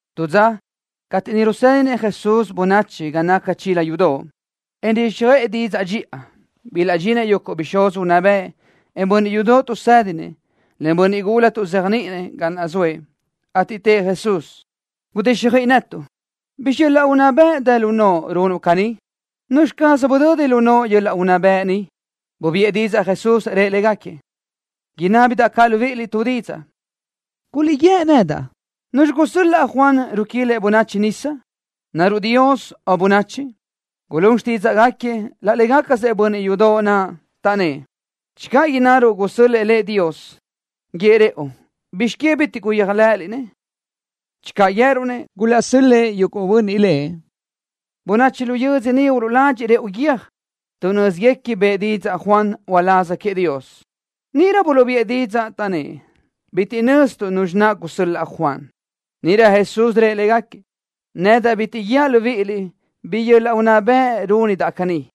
Tu dza, cateʼ niʼ rusédinëʼ Jesús bönachi ga naca chila yudoʼ, en riguíxjöʼë didzaʼ dxiʼa, bilaʼdxinëʼ yuguʼ bixúz unná bëʼ, en bönniʼ yudoʼ tuʼsédinëʼ, len bönniʼ gula tuʼzéajniʼinëʼ, ga naʼ zoëʼ, ateʼ tëʼ Jesús: —Gudixjöiʼi netuʼ. ¿Bizxi yöl-laʼ unná bëʼ dë lu noʼo runuʼ caní? ¿Nuzxi caz budödi lu noʼo yöl-laʼ unná bëʼ ni? Bubiʼë didzaʼ Jesús, rëʼ légaquiëʼ: —Inábidaʼ caʼ libíʼiliʼ tu didzaʼ, ateʼ ubíʼiliʼ innaliʼ. ¿Nuzxi gusö́l-laʼ Juan ruquilëʼ bönachi nisa? ¿Naruʼ Dios, o bönachi? Gulún xtídzaʼgaquiëʼ laʼ légacasëʼ bönniʼ yudoʼ naʼ, taʼnnë́ʼ: —Channö innaruʼ: Gusö́l-lëʼë Dios lëʼ, guíëʼ rëʼu: “¿Bizx que bitiʼ guyéajlëʼëliʼ-nëʼ?” Channö guië́ruʼ-nëʼ: Gulaʼsö́l-lëʼë yuguʼ bönniʼ lëʼ, bönachi lu yödzö ni uluʼladxiʼ rëʼu guiö́j, tuʼ nö́ziguequi bëʼë didzaʼ Juan naʼ uláz queëʼ Dios. Níʼirö buluʼbiʼë didzaʼ, taʼnnë́ʼ: —Bitiʼ nöztuʼ nuzxi naʼ gusö́l-laʼ Juan. Níʼirö Jesús rëʼ légaquiëʼ: —Nedaʼ caʼ bitiʼ guíaʼ libíʼiliʼ bi yöl-laʼ unná bëʼ rúnidaʼ caní.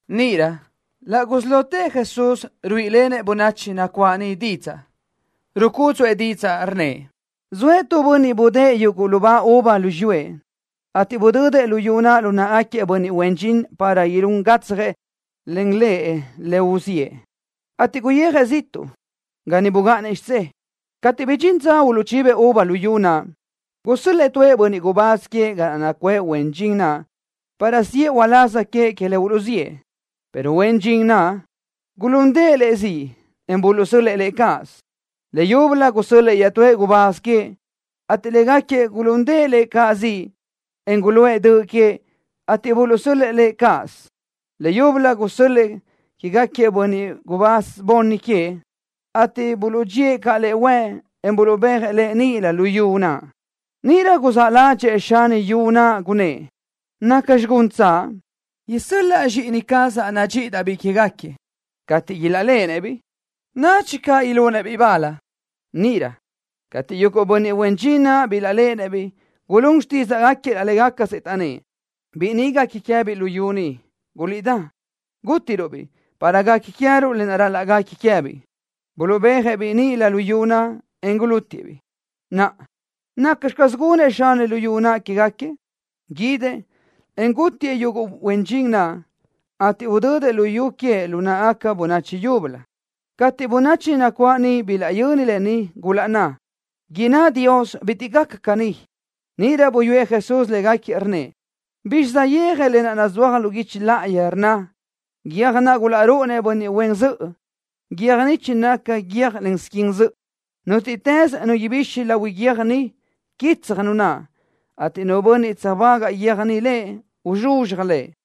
Níʼirö laʼ gusí lotëʼ Jesús ruíʼilenëʼ bönachi nacuáʼ niʼ didzaʼ. Rucúdzuʼë didzaʼ, rnnëʼ: —Zoëʼ tu bönniʼ budë́ʼë yuguʼ lubá uva lu xiyúëʼ, ateʼ budödëʼ luyú naʼ lu náʼagaquiëʼ bönniʼ huen dxin para ilún gatsjëʼ len lëʼ le uluʼziʼë, ateʼ guyijëʼ ziʼtuʼ ga niʼ bugáʼanëʼ xidzé. Cateʼ bidxín dza uluʼchibëʼ uva luyú naʼ, gusö́l-lëʼë tuëʼ bönniʼ gubáz queëʼ ga naʼ nacuʼë huen dxin naʼ para siʼë uláz queëʼ que le uluʼziʼë, pero huen dxin naʼ gulúndëʼë lëʼ ziʼ, en buluʼsö́l-lëʼë lëʼ cáʼasö. Leyúbölö gusö́l-lëʼë iaʼtúëʼ gubáz queëʼ, ateʼ légaquiëʼ gulúndëʼë lëʼ caʼ ziʼ, en guluʼë döʼ queëʼ, ateʼ buluʼsö́l-lëʼë lëʼ cáʼasö. Leyúbölö gusö́l-lëʼë quégaquiëʼ bönniʼ bunni gubáz queëʼ, ateʼ buluʼdxíëʼ caʼ lëʼ huëʼ, en buluʼbéajëʼ lëʼ níʼilö luyú naʼ. ’Níʼirö guzáʼ ládxëʼë xani luyú naʼ, gunnë́ʼ: “¿Nacxi guntsaʼ? Isö́l-laʼa zxíʼini cazaʼ nadxíʼidaʼ-biʼ quégaquiëʼ. Cateʼ ilaʼléʼenëʼ-biʼ, nadxi caʼ ilunëʼ-biʼ bal.” Níʼirö, cateʼ yuguʼ bönniʼ huen dxin naʼ bilaʼléʼenëʼ-biʼ, gulún xtídzaʼgaquiëʼ laʼ légacasëʼ, taʼnnë́ʼ: “Biʼi ni guequi queë́biʼ luyú ni. Guliʼdá, gútiruʼ-biʼ, para guequi queë́ruʼ le ral-laʼ guequi queë́biʼ.” Buluʼbéajëʼ-biʼ níʼilö luyú naʼ, en gulútiëʼ-biʼ. ’Naʼa, ¿nacxi caz gunëʼ xani luyú naʼ quégaquiëʼ? Guídëʼ, en gútiëʼ yuguʼ huen dxin naʼ, ateʼ udödëʼ luyú queëʼ lu náʼagaca bönachi yúbölö. Cateʼ bönachi nacuáʼ niʼ bilaʼyöni lë ni, gulaʼnnë́ʼ: —¡Inná Dios bitiʼ gaca caní! Níʼirö buyúëʼ Jesús légaquiëʼ, rnnëʼ: —¿Bizxi saʼyéaj lë naʼ nazúaj lu guichi láʼayi, rnna: Guiö́j naʼ gulaʼrúʼunëʼ bönniʼ huen zöʼö, guiö́j ni chinaca guiö́jlen squin zöʼö? Nútiʼtës nu ibixi lahui guiö́j ni, quitsaj nu naʼ, ateʼ nu bönniʼ tsöjbágaʼ guiö́j ni lëʼ, uzxuzxaj lëʼ.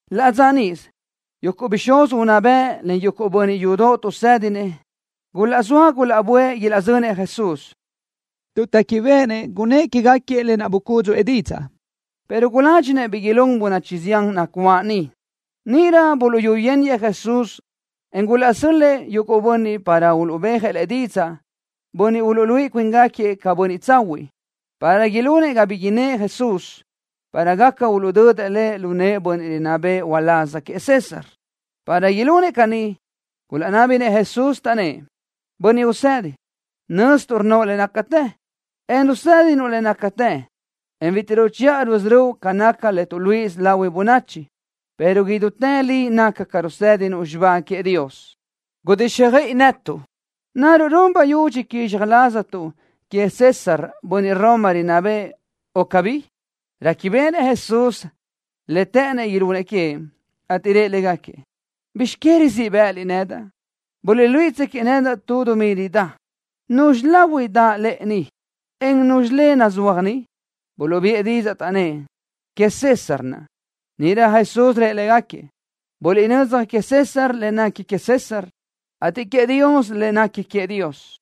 Laʼ dza níʼisö, yuguʼ bixúz unná bëʼ len bönniʼ yudoʼ tuʼsédinëʼ gulaʼzóa gulaʼböʼë ilaʼzönëʼ Jesús, tuʼ téquibeʼenëʼ gunnë́ʼ quégaquiëʼ lë naʼ bucúdzuʼë didzaʼ, pero guládxinëʼ bi ilún bönachi zián nacuáʼ niʼ. Níʼirö buluʼyúyeniëʼ Jesús, en gulaʼsö́l-lëʼë yuguʼ bönniʼ para uluʼbéajëʼ Lëʼ didzaʼ, bönniʼ uluʼluíʼi cuíngaquiëʼ ca bönniʼ tsahuiʼ, para ilunëʼ ga bi innë́ʼ Jesús, para gaca uluʼdödëʼ Lëʼ lu nëʼë bönniʼ rinná béʼenëʼ uláz queëʼ César. Para ilunëʼ caní, gulaʼnábinëʼ Jesús, taʼnnë́ʼ: —Bönniʼ Usedi, nöztuʼ rnnoʼ le nácatë, en rusédinuʼ le nácatë, en bitiʼ ruchiʼa rusörö́uʼ ca naca le tuʼluíʼisö lahui bönachi, pero idútë li naca ca rusédinuʼ xibá queëʼ Dios. Gudíxjöiʼi netuʼ. ¿Naruʼ run bayudxi quizxaj laztuʼ queëʼ César, bönniʼ Roma rinná bëʼë, o cabí? Réquibeʼenëʼ Jesús le të́ʼënnëʼ ilunëʼ queëʼ, ateʼ rëʼ légaquiëʼ: —¿Bizx que rizíʼ bë́ʼëliʼ nedaʼ? Buliʼluíʼitsöquiʼ nedaʼ tu dumí ridá. ¿Nuzxi lahui daʼ lëʼe ni, en nuzxi le nazúaj ni? Buluʼbiʼë didzaʼ, taʼnnë́ʼ: —Queëʼ César naʼ. Níʼirö Jesús rëʼ légaquiëʼ: —Buliʼnö́dzaj queëʼ César le nequi queëʼ César, ateʼ queëʼ Dios le nequi queëʼ Dios.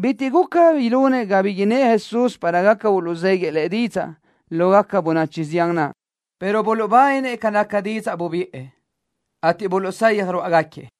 Bitiʼ guca ilunëʼ ga bi innë́ʼ Jesús para gaca uluʼzéguiëʼ Lëʼ didzaʼ lógaca bönachi zián naʼ, pero buluʼbáninëʼ ca naca didzaʼ bubiʼë, ateʼ buluʼsayaj ruáʼagaquiëʼ.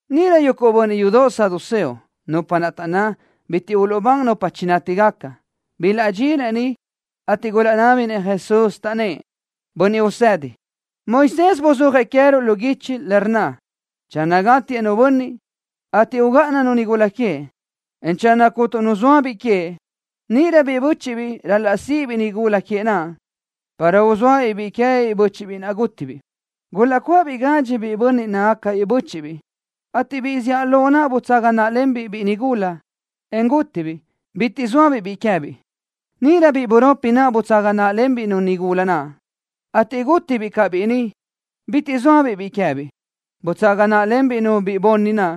Níʼirö yuguʼ bönniʼ yudoʼ saduceo, nupa naʼ taʼnná bitiʼ uluʼbán nupa chinátigaca, bilaʼdxinëʼ niʼ, ateʼ gulaʼnábinëʼ Jesús, taʼnnë́ʼ: —Bönniʼ Usedi, Moisés buzúajëʼ queë́ruʼ lu guichi, le rnna: “Channö gátiëʼ nu bönniʼ, ateʼ ugáʼananu nigula queëʼ, en channö cuntu nu zoa biʼi queëʼ, níʼirö biʼi bö́chiʼbiʼ ral-laʼ síʼibiʼ-nu nigula queëʼ naʼ, para uzóabiʼ biʼi queëbiʼ bö́chiʼbiʼ naʼ gútibiʼ.” Gulaʼcuáʼabiʼ gadxi biʼi bönniʼ nácagacabiʼ bö́chiʼbiʼ, ateʼ biʼi zíʼalö naʼ butsaga náʼalenbiʼ biʼi nigula, en gútibiʼ, bitiʼ zóabiʼ biʼi queë́biʼ. Níʼirö biʼi buropi naʼ butsaga náʼalenbiʼ-nu nigula naʼ, ateʼ gútibiʼ caʼ biʼi ni, bitiʼ zóabiʼ biʼi queë́biʼ. Butsaga náʼalenbiʼ-nu biʼi bunni naʼ,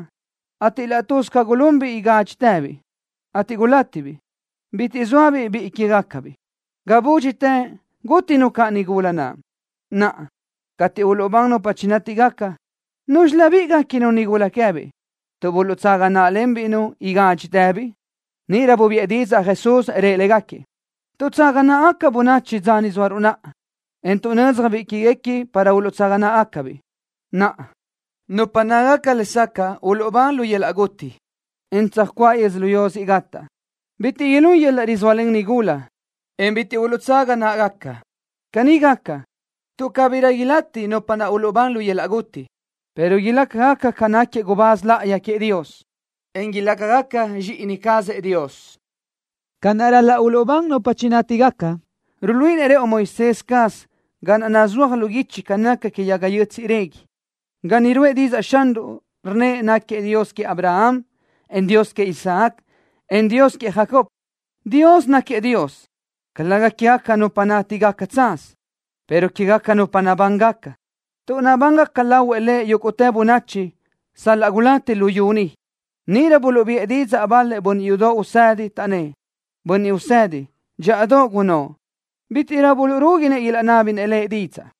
ateʼ laʼ tuz ca gulunbiʼ igádxitëbiʼ, ateʼ gulátibiʼ, bitiʼ zóabiʼ biʼi quégacabiʼ. Ga búdxitë, gútinu caʼ nigula naʼ. Naʼa, cateʼ uluʼbán nupa chinátigaca, ¿núzxilöbiʼ guéquinu nigula naʼ queë́biʼ, tuʼ buluʼtsaga náʼalenbiʼ-nu igádxitëbiʼ? Níʼirö bubiʼë didzaʼ Jesús, rëʼ légaquiëʼ: —Tuʼtsága náʼagaca bönachi dza ni zóaruʼ naʼa, en tuʼnödzjëʼ-biʼ zxíʼinigaquiëʼ para uluʼtsaga náʼagacabiʼ. Naʼa, nupa nácagaca lesacaʼ uluʼbán lu yöl-laʼ guti, en tsöjcuáʼ yödzölió siʼ gataʼ, bitiʼ ilún yöl-laʼ rizóalen nigula, en bitiʼ uluʼtsaga náʼagaca. Caní gaca, tuʼ cabirö ilati nupa naʼ uluʼbán lu yöl-laʼ guti, pero ilácagaca ca nácagaquiëʼ gubáz láʼayi queëʼ Dios, en ilácagaca zxíʼini cazëʼ Dios. Ca naʼ ral-laʼ uluʼbán nupa chinátigaca, ruluíʼinëʼ rëʼu Moisés caz ga naʼ nazúaj lu guichi ca naca que yaga yötsiʼ régui, ga niʼ ruʼë didzaʼ Xanruʼ, rnnëʼ náquiëʼ Dios queëʼ Abraham, en Dios queëʼ Isaac, en Dios queëʼ Jacob. Dios náquiëʼ Dios, calëga quégaca nupa nátigaca tsaz, pero quégaca nupa nabángaca, tuʼ nabángaca lahuëʼ Lëʼ yúguʼtë bönachi, sal-laʼ gulati luyú ni. Níʼirö buluʼbiʼë didzaʼ bal-lëʼ bönniʼ yudoʼ usedi, taʼnnë́ʼ: —Bönniʼ Usedi, dxíʼadoʼ gunnóʼ. Bítiʼrö buluʼrúguinëʼ ilaʼnábinëʼ Lëʼ didzaʼ.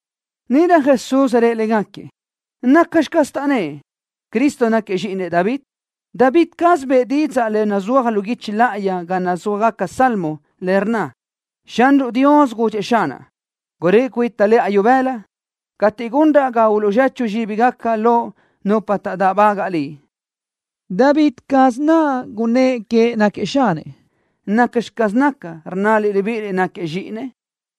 Níʼirö Jesús rëʼ légaquiëʼ: —¿Nacxi caz naʼ taʼnnë́ʼ: “Cristo náquiëʼ zxíʼinëʼ David”? David caz bëʼë didzaʼ le nazúaj lu guichi láʼayi ga nazúajgaca salmo, le rnna: Xanruʼ Dios gudxëʼ Xanaʼ: “Guröʼi cuita lëʼa ibëla cateʼ gunraʼ ga uluʼzechu zxíbigaca loʼ nupa taʼdáʼbagaʼ Liʼ.” David caz naʼ gunnë́ʼ queëʼ náquiëʼ Xanëʼ. ¿Nacxi caz naca, rnnaliʼ libíʼiliʼ náquiëʼ zxíʼinëʼ?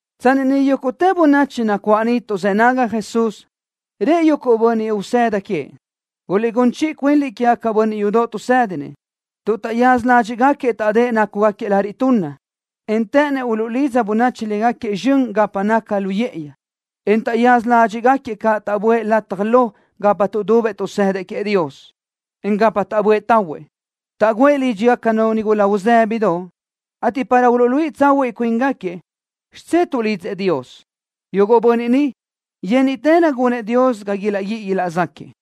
Tsanni niʼ yúguʼtë bönachi nacuáʼ niʼ tuʼzë́ nágagaca Jesús, rëʼ yuguʼ bönniʼ usëda queëʼ: —Guliʼgún chiʼi cuinliʼ quégaquiëʼ bönniʼ yudoʼ tuʼsédinëʼ, tuʼ taʼyaza ládxiʼgaquiëʼ taʼdë́ʼ nácugaquiëʼ lariʼ tunna, en të́ʼënnëʼ uluʼlidza bönachi légaquiëʼ zxön gapa naca lu yë́ʼëyi, en taʼyaza ládxiʼgaquiëʼ caʼ taʼböʼë lataj lo gapa tuʼdubëʼ tuʼsëdëʼ queëʼ Dios, en gapa taʼböʼë tahuëʼ. Taʼgǘëʼ lídxigacanu nigula uzë́bidoʼ, ateʼ para uluʼluíʼi tsahuiʼ cuíngaquiëʼ, xidzé tuʼlidzëʼ Dios. Yuguʼ bönniʼ ni, yénniʼtërö gunëʼ Dios ga ilaʼguíʼi ilaʼzáquiëʼ.